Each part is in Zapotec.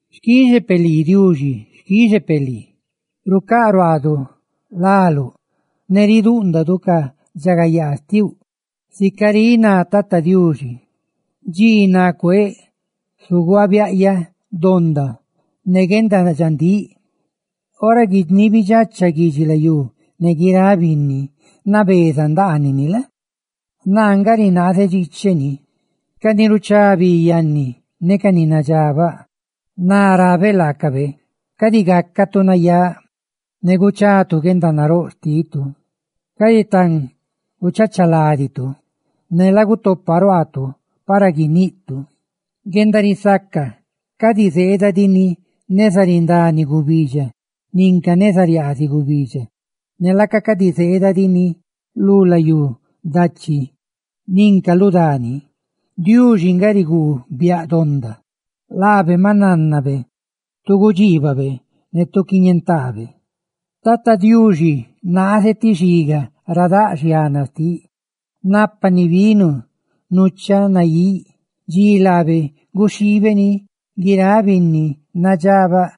Xquixe peꞌ lii Diuxi, xquixe peꞌ lii; rucáꞌ ruaaduꞌ láluꞌ ne ridúꞌndadu ca guendaridxagayaa xtiuꞌ. Sica riꞌ ná Tata Diuxi: «Dxi ni cuéꞌ, zuguaabiaꞌyaꞌ donda ne guendadxandíꞌ. Ora guiniibidxacha guidxilayú, ne guiráꞌ ni nabeza ndaaniꞌ ni, naa nga rinaazeꞌ dxicheꞌ ñeeni.» Ca ni ruchá bi yanni ne ca ni nadxabaꞌ, rabeꞌ laacaꞌ: «Cadi gácatu nayáꞌ ne guchatu guendanaróꞌ xtitu; cadi tan guchachaladitu ne lagutopa ruaatu para guiniꞌtu.» Guendarisaca cadi zeeda diꞌ ni neza rindani gubidxa nin ca neza riaaziꞌ gubidxa, ne laaca cadi zeedani lu layú dachi ninca lu dani, Diuxi si nga riguu biaꞌ donda; laabe maꞌ nánnabe tu gudxiibabe ne tu quiñentaabe. Tata Diuxi naaze ti xiga ra daꞌ xiana xtiꞌ, nápani vino nuchaꞌ naíꞌ. Dxi laabe guxhiibe ni, guiráꞌ binni nadxabaꞌ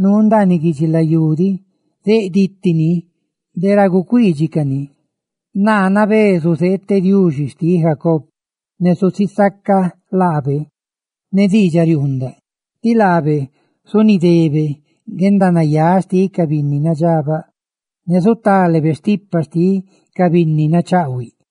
nuu ndaaniꞌ guidxilayú diꞌ zeꞌ diticani de ra gucuiidxicani. Naa nabé zuzeeteꞌ Diuxi xtiꞌ Jacob, ne susisacaꞌ laabe ne diidxariuundaꞌ; ti laabe zunidebe guendanayáꞌ xtiꞌ ca binni nadxabaꞌ, ne zutalebe stipa xtiꞌ ca binni nachaꞌhuiꞌ.